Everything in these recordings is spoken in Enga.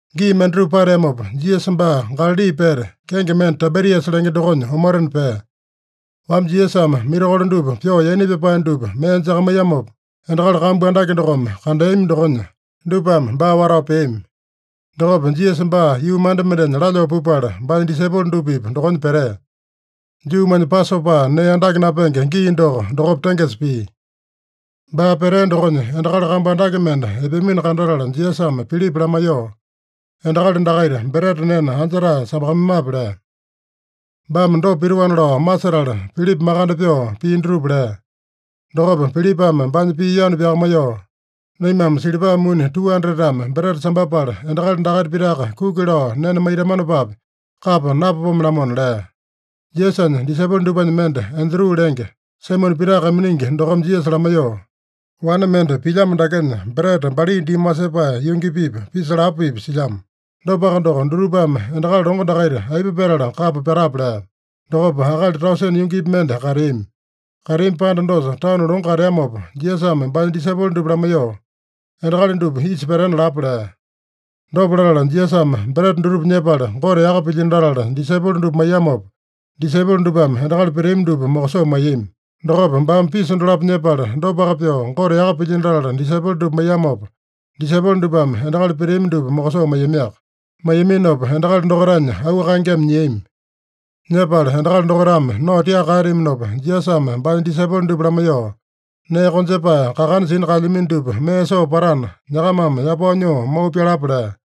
Gii mendatupa pateamopa, Jisasa baa Galali pete, kenge mende Taibiriasa lenge dokonya omotena pea. Wamba Jisasame mirakolo dupa pyoo yaina pyapae dupa mee jakamaiyamopa, endakali kambu andake dokome kandeami dokonya, dupame baa watao peami. Dokopa Jisasa baa yuu manda mendenya lalyoo pupala, baanya disaipolo dupa-pipa dokonya petea. (Juumanya Pasopa nee andake napenge gii doko, dokopa tengesa pia.) Baa petea dokonya endakali kambu andake mende epeamino kandatala, Jisasame Pilipa lamaiyoo, “Endakali dakaita breta nena anja-tae sambakamaimape?” lea. (Baame dopa pitoana lao masetala, Pilipa makande pyoo pii dutupa lea.) Dokopa Pilipame baanya pii yanu pyakamaiyoo, “Naimame silipa muni 200-tame breta sambapala endakali dakaita pitaka kuki lao nena maitamanopapi kapa napapome-lamona” lea. Jisasanya disaipolo dupanya mende, Andru lenge, Saimone Pita kaiminingi dokome Jisasa lamaiyoo, “Wane mende pilyamo dakenya breta bali diimi wasepae yungi-pipa, pisa lapo-pipa silyamo. Dopaka doko, dutupame endakali longo dakaita aipa petala kapa patape?” lea. Dokopa akali tausene yungipi mende kateami. Kateami panda dosa tanu longo kateamopa, Jisasame baanya disaipolo dupa lamaiyoo, “Endakali dupa isa petena lapa” lea. Dopa latala Jisasame breta dutupa nyepala, Gote yaka pilyino latala, disaipolo dupa maiyamopa, disaipolo dupame endakali peteami dupa mokosoo maiyami. Dokopa baame pisa dolapo nyepala, dopaka pyoo Gote yaka pilyino latala, disaipolo dupa maiyamopa, disaipolo dupame endakali peteami dupa mokosoo maiyamiaka. Maiyaminopa endakali dokaitanya auu kaengeme nyiami. Nyepala endakali dokaitame nao tiaka kaeteaminopa, Jisasame baanya disaipolo dupa lamaiyoo, “Nee konjepae kakana sina kaelyamino dupa mee soo patana, nyakamame yapao nyoo mau pyalapa” lea.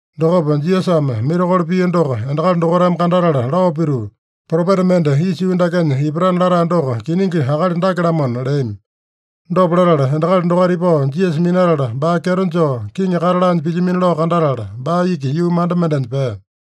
Dokopa Jisasame mirakolo pia doko endakali dokaitame kandatala lao pituu, “Propeta mende isa yuu dakenya ipatana latae doko kiningi akali dake-lamona” leami. Dopa latala, endakali dokaita ipao Jisasa minatala baa kyeto joo kiŋi kata laanya pilyamino lao kandatala, baa iki yuu manda mendenya pea.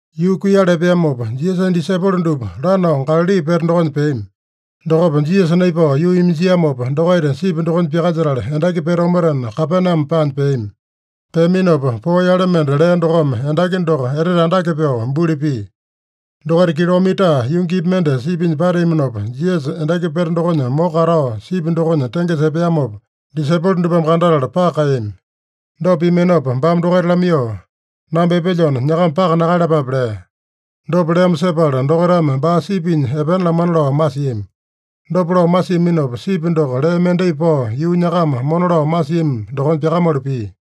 Yuu kuiyala epeamopa, Jisasanya disaipolo dupa lanao Galali pete dokonya peami. Dokopa Jisasa naipao yuu iminjiamopa, dokaita sipi dokonya pyakalyetala endaki pete omotena, Kapename paanya peami. Peaminopa poo yale mende lea dokome, endaki doko etete andake pyoo buli pia. Dokaita kilomita yungipi mende sipinya pateaminopa, Jisasa endaki pete dokonya moko katao sipi dokonya tengesa epeamopa, disaipolo dupame kandatala paka kaeyami. Dopa piaminopa baame dokaita lamaiyoo, “Namba epelyona, nyakama paka nakaeyalapape” lea. Dopa leamo sepala dokaitame baa sipinya epena lamana lao masiami. Dopa lao masiaminopa, sipi doko lee mendai pao yuu nyakama mona lao masiami dokonya pyakamalu pia.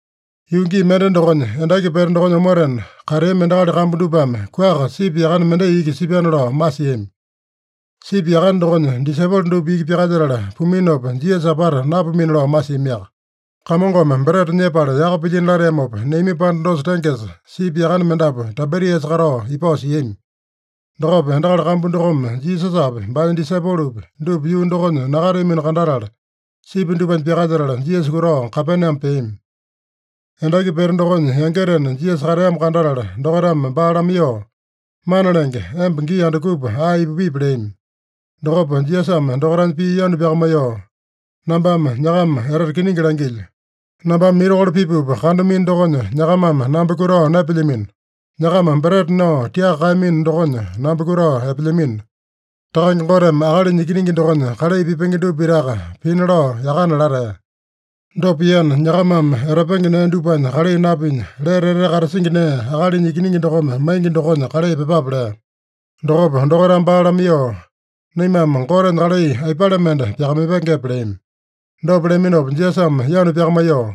Yuu gii mende dokonya, endaki pete dokonya omotena kateami endakali kambu dupame kuaka sipi yakane mendai iki sipyana lao masiami. Sipi yakane dokonya disaipolo dupa iki pyakalyetala puminopa, Jisasa apata napumina lao masiamiaka. Kamongome breta nyepala yaka pilyino lateamopa neami panda dosa tengesa, sipi yakane mendapu Taibiriasa katao ipao siami. Dokopa endakali kambu dokome Jisasapi, baanya disaipolopi, dupa yuu dokonya nakateamino kandatala, sipi dupanya pyakalyetala Jisasa kutao Kapename peami. Endaki pete dokonya yangitena Jisasa kateamo kandatala, dokaitame baa lamaiyoo, “Mana Lenge, emba gii andukupa ae ipupipi?” leami. Dokopa Jisasame dokaitanya pii yanu pyakamaiyoo, “Nambame nyakama etete kiningi langilyo: Nambame mirakolo pipupa kandamino dokonya, nyakamame namba kutao naepelyamino. Nyakama breta nao tiaka kaeyamino dokonya, namba kutao epelyamino. Takange Goteme Akalinya Ikiningi dokonya kalai pipenge dupa pitaka pina lao yakana latea. Dopa piana, nyakamame etapenge nee dupanya kalai napinya, lete etete katasingi nee, Akalinya Ikiningi dokome maingi dokonya kalai pyepape” lea. Dokopa dokaitame baa lamaiyoo, “Naimame Gotenya kalai aipale mende pyakamaipengepe?” leami. Dopa leaminopa Jisasame yanu pyakamaiyoo,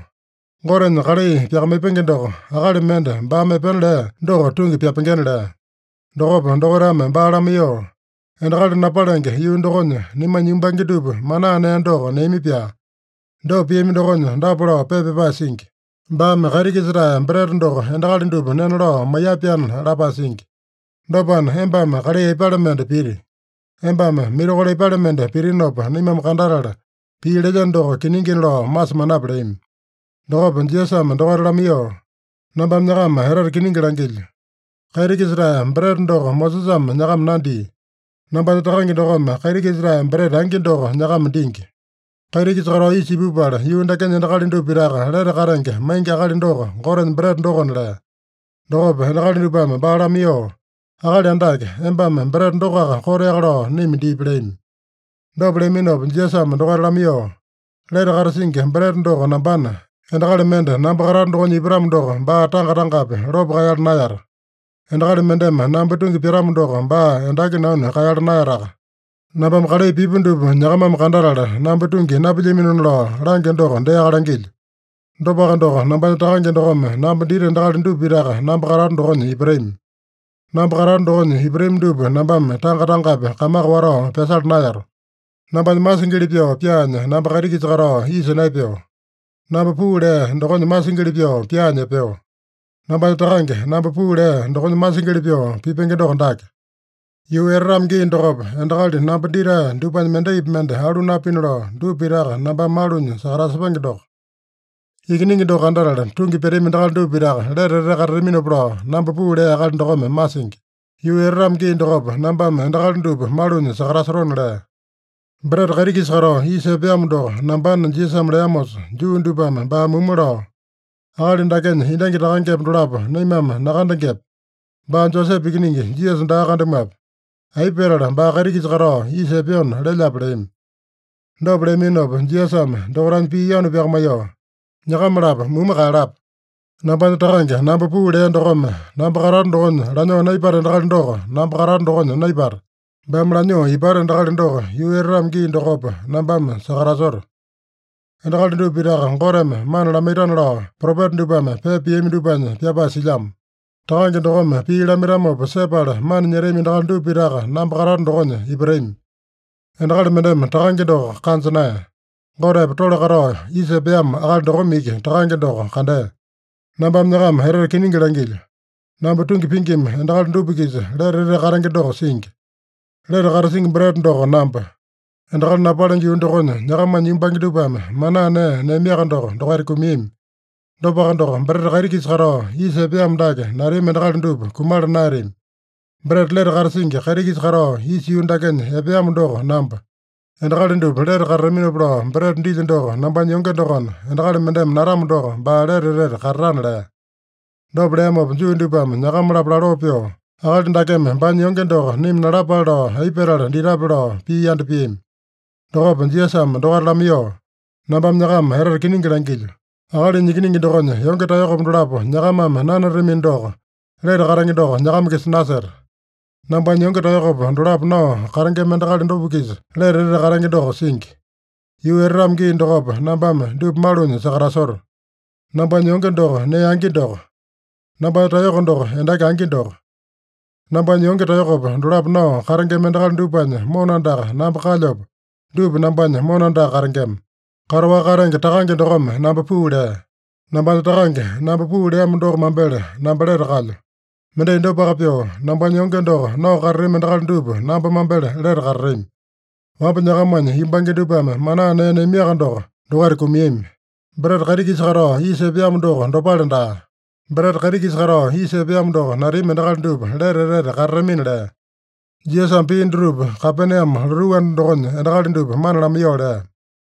“Gotenya kalai pyakamaipenge doko, akali mende baame epena lea doko tungi pyapengena” lea. Dokopa dokaitame baa lamaiyoo, “Endakali napalenge yuu dokonya naimanya yumbange dupa manaa nee doko neami-pyaa. Dopa piami dokonya dapa lao pepa pyapae singi: ‘Baame kaiti-kisa-tae breta doko endakali dupa nena lao maiya-pyaana’ lapae singi. Dopana, embame kalai aipale mende piti? Embame mirakolo aipale mende pitinopa naimame kandatala, pii lelyeno doko kiningina lao masemanape?” leami. Dokopa Jisasame dokaita lamaiyoo, “Nambame nyakama etete kiningi langilyo: Kaiti-kisa-tae breta doko Mosesame nyakama nandia. Nambanya Takange dokome kaiti-kisa-tae breta angi doko nyakama dingi. Kaiti-kisa katao isa ipupala, yuu dakenya endakali dupa pitaka lete katenge maingi akali doko, Gotenya breta dokona” lea. Dokopa endakali dupame baa lamaiyoo, “Akali Andake, embame breta dokoaka koteaka lao naima dipi” leami. Dopa leaminopa Jisasame dokaita lamaiyoo, “Lete katasingi breta doko nambana, endakali mende namba katato dokonya ipatamo doko, baa tanga-tangapi lopo kaeyala naeyata. Endakali mendeme namba tungi pyatamo doko, baa endaki nanu kaeyala naeyataka. Nambame kalai pipu dupa nyakamame kandatala, namba tungi napilyaminona lao langyo doko deaka langilyo. Dopaka doko, nambanya Takange dokome namba dita endakali dupa pitaka namba katato dokonya ipatami. Namba katato dokonya ipatami dupa nambame tanga-tangapi kamaka watao pyasala naeyato. Nambanya masingili pyoo pyaanya namba kaiti-kisa katao isa naepeo. Namba puu lea dokonya masingili pyoo pyaanya epeo. Nambanya Takange, namba puu lea dokonya masingili pyoo pipenge doko dake: Yuu etatamo gii dokopa, endakali namba ditae dupanya mendaipi mende alu napina lao, dupa pitaka nambame malunya sakatasepenge doko. Ikiningi doko kandatala tungi pyatami endakali dupa pitaka lete etete katataminopa lao namba puu lea Akali dokome masingi. Yuu etatamo gii dokopa nambame endakali dupa malunya sakatasotona” lea. “Breta kaiti-kisa katao isa epeamo doko nambana” Jisasame leamosa, Juu dupame baa mumu lao, “Akali dakenya endangi takangepa dolapo naimame nakandengepe? Baa Josepe ikiningi Jisasa daa kandamuape? Aipa petala baa kaiti-kisa katao isa epeona lelyape?” leami. Dopa leaminopa Jisasame dokaitanya pii yanu pyakamaiyoo, “Nyakama-lapo mumu kaeyalapa. Nambanya Takange, namba puu lea dokome namba katato dokonya lanyoo naipata endakali doko namba katato dokonya naipata. Baame lanyoo ipata endakali doko, yuu etatamo gii dokopa nambame sakatasoto. ‘Endakali dupa pitaka Goteme mana lamaitana’ lao propeta dupame pepa piami dupanya pyapae silyamo. Takange dokome pii lamaitamopa sepala mana nyetami endakali dupa pitaka namba katato dokonya ipatami. Endakali mendeme Takange doko kanja naeya. Gotepa tole katao isa epeamo akali dokome iki Takange doko kandea. Nambame nyakama etete kiningi langilyo: Namba tungi pingima endakali dupa-kisa lete etete katenge doko singi. Lete katasingi breta doko namba. Endakali napalenge yuu dokonya nyakamanya yumbange dupame manaa nee neamiaka doko, dokaita kumiami. Dopaka doko, breta kaiti-kisa katao isa epeamo dake natami endakali dupa kumala naeyatami. Breta lete katasingi kaiti-kisa katao isa yuu dakenya epeamo doko namba. Endakali dupa lete katataminopa lao breta dilyo doko nambanya yonge dokona, endakali mendeme natamo doko, baa lete etete katatana” lea. Dopa leamopa, Juu dupame nyakama-lapo laloo pyoo, “Akali dakeme baanya yonge doko naima nalapale lao aipa petala ditape?” lao pii yanda piami. Dokopa Jisasame dokaita lamaiyoo, “Nambame nyakama etete kiningi langilyo: Akalinya Ikiningi dokonya yonge taeyokopa dolapo nyakamame nanatamino doko, lete katenge doko nyakama-kisa naseta. Nambanya yonge taeyokopa dolapo nao katengema endakali dupa-kisa lete etete katenge doko singi. Yuu etatamo gii dokopa, nambame dupa malunya sakatasoto. Nambanya yonge doko nee angi doko. Nambanya taeyoko doko endaki angi doko. Nambanya yonge taeyokopa dolapo nao katengema endakali dupanya mona andaka namba kalyopa, dupa nambanya mona andaka katengema. Kataowaka katenge Takange dokome namba puu lea. Nambanya Takange, namba puu leamo doko mambele namba lete kalyo. Mendai dopaka pyoo, nambanya yonge doko nao katatami endakali dupa namba mambele lete katatami. Wamba nyakamanya yumbange dupame manaa nee neaminoaka doko, dokaita kumiami. Breta kaiti-kisa katao isa epeamo doko dopale daa. Breta kaiti-kisa katao isa epeamo doko natami endakali dupa lete etete katatamina” lea. Jisasame pii dutupa Kapename lotuu anda dokonya endakali dupa mana lamaiyoo lea.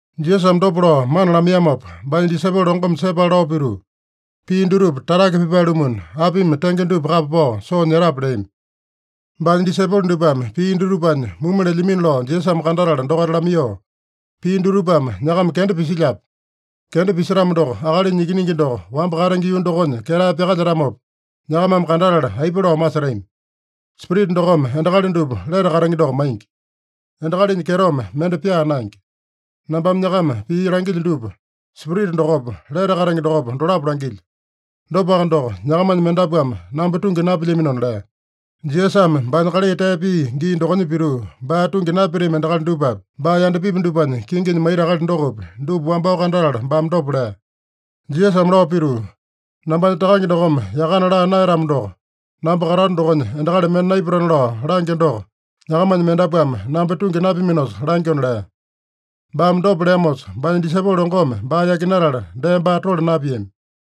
Jisasame dopa lao mana lamaiyamopa, baanya disaipolo longome sepala lao pituu, “Pii dutupa tatake pipae-lumuna, apimi tenge dupa kapa pao soo nyetape?” leami. Baanya disaipolo dupame pii dutupanya mumu lelyamino lao Jisasame kandatala dokaita lamaiyoo, “Pii dutupame nyakama kenda pisilyape? Kenda pisetamo doko, Akalinya Ikiningi doko wamba katenge yuu dokonya ketae pyakalyetamopa, nyakamame kandatala aipa lao masetami? Spirita dokome endakali dupa lete katenge doko maingi. Endakalinya kyetome mende pyaa naenge. Nambame nyakama pii langilyo dupa, Spirita dokopa, lete katenge dokopa, dolapo langilyo. Dopaka doko, nyakamanya mendapuame namba tungi napilyaminona” lea. (Jisasame baanya kalai tee pia gii dokonya pituu, baa tungi napyatami endakali dupapi, baa yandapipi dupanya kinginya maita akali dokopi, dupa wambao kandatala baame dopa lea.) Jisasame lao pituu, “Nambanya Takange dokome yakana laa naeyatamo doko, namba katato dokonya endakali mende naipatana lao langyo doko, nyakamanya mendapuame namba tungi napyaminosa langyona” lea. Baame dopa leamosa, baanya disaipolo longome baa yakinatala, dee baa tole napiami.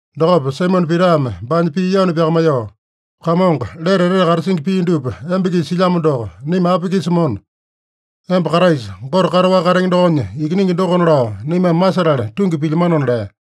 Dokopa Saimone Pitame baanya pii yanu pyakamaiyoo, “Kamongo, lete etete katasingi pii dupa emba-kisa silyamo doko, naima api-kisa mona? Emba Kraisa, Gote kataowaka katenge dokonya Ikiningi dokona lao naimame masetala tungi pilyamanona” lea.